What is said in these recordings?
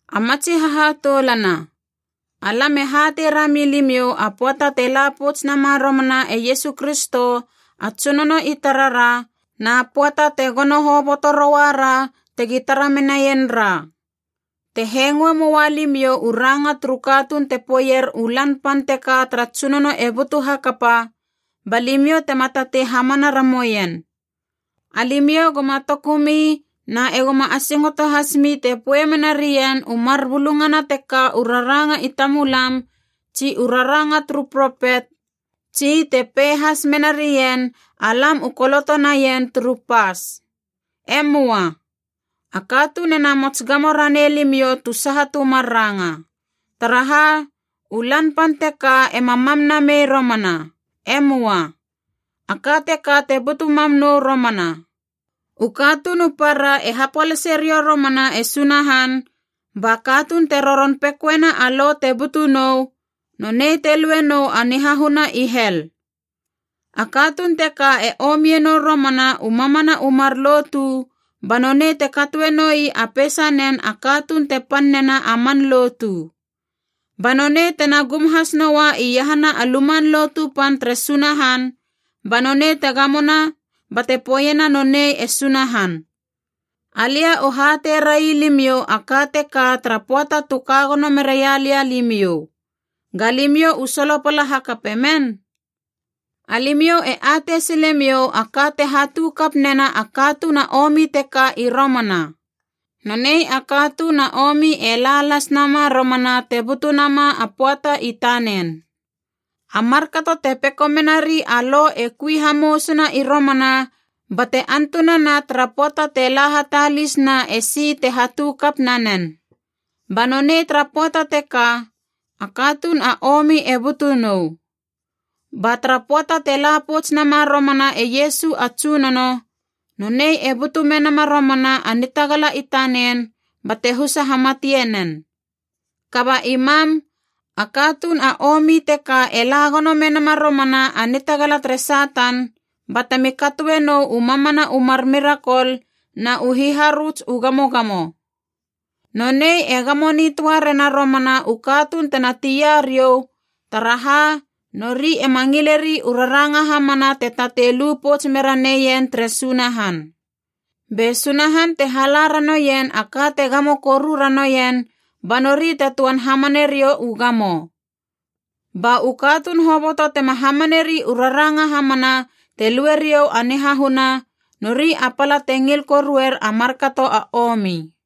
A matsi hahatoulana, alam e hatei rami limiou a pöata te la pouts nama romana e Iesu Kristo a Tsunono i tarara na pöata te gono hoboto roua ra tegi tara menaien ra. Te hengoe moua limiou u ranga turu katuun te poeier u Lan Pan teka tara Tsunono e butu hakapa, ba limiou tema tatei hamana ramoien. Alimiou goma tokumi na e goma asingoto hasmi te poe menarien u mar bulungana teka u raranga i tamulam tsi u raranga turu propet, tsi te pei has mena rien alam u koloto naien turu pas. E möa. A katuun e namots gamo ranei limiou tu saha tu mar ranga. Taraha, u Lan Pan teka ema mam namei romana. E möa. A ka teka te butu mam nou romana: u katuun u para e hapolase riou romana e Sunahan, ba katuun te roron pekoena a lo te butu nou, nonei te lue nou a nihahuna i hel. A katuun teka e omie nou romana u mamana u mar lotu, ba nonei te katoe noi a peisanen a katuun te pan nena a man lotu. Ba nonei tena gum has noua iahana a Luman Lotu Pan tere Sunahan ba nonei te gamona bate poeiena nonei e Sunahan. Alia u hatei railimiou a ka teka tara pöata tu ka gono meraia lia limiou. Ga limiou u solopala hakape men? Alimiou e atei silemiou a ka te hatu kap nena a katuun a omi teka i romana. Nonei a katuun a omi e la las nama romana te butu nama a pöata i tanen. A markato te peko menari a lo e kui hamousuna i romana bate antunana tara pöata te la hatalis na e si te hatu kap nanen. Ba nonei tara pöata teka, a katuun a omi e butu nou. Ba tara pöata te la pouts nama romana e Iesu a Tsunono, nonei e butu menama romana a nitagala i tanen bate husa hamatie nen. Kaba i mam, a katuun a omi teka e la gono menama romana a nitagala tere Satan, batemi katoe nou u mamana u mar mirakol na u hiharöts u gamogamo. Nonei e gamo nitöa rena romana u katuun tena tia riou, taraha nori ema ngileri u raranga hamana te tatei lu pouts mera neien tere Sunahan. Be Sunahan te hala ranoien a ka te gamo koru ranoien, ba nori te töan hamane riou u gamo. Ba u katuun hoboto tema hamaneri u raranga hamana te lue riou a nihahuna, nori a pala te ngil koruer a markato a omi.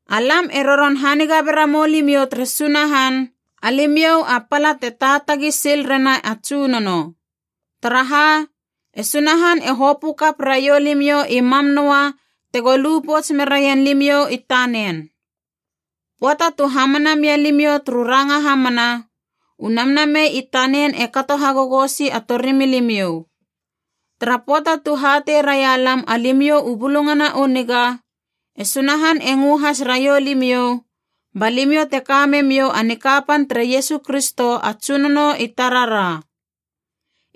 Alam e roron haniga bera mou limiou tere Sunahan, alimiou a pala te taatagi sil rena a Tsunono. Taraha, e Sunahan e hopö kap raiou limiou i mam noa tego lu pouts meraien limiou i tanen. Pöata tu hamana mia limiou turu ranga hamana, u Namnamei i tanen e kato hagogosi a torimilimiou. Tara pöata tu hatei raia lam alimiou u Bulungana u Niga, e Sunahan e ngö has raiou limiou, ba limiou te ka memiou a nikapan tere Iesu Kristo a Tsunono i tarara.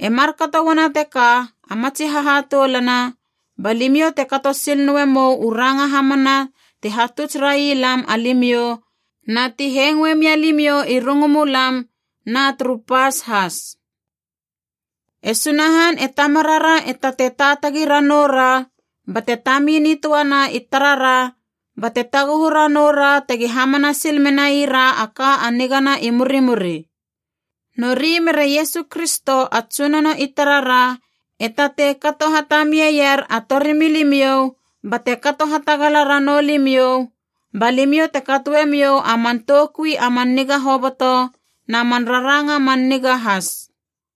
E markato uana teka a matsi hahatoulana, ba limiou te kato sil noe mou u ranga hamana ti hatuts rai lam alimiou na ti hengoe mialimiou i rungumulam na turu pas has. E Sunahan e Tamarara e tatei taatagi ranoura bate tami nitöana i tarara bate taguhu ranoura tegi hamana sil menaira a ka a nigana i murimuri. Nori mere Iesu Kristo a Tsunono i tarara e tatei kato hatamie ier a torimilimiou bate kato hatagala ranou limiou ba limiou te katoemiou a man toukui a man niga hoboto na man raranga man niga has.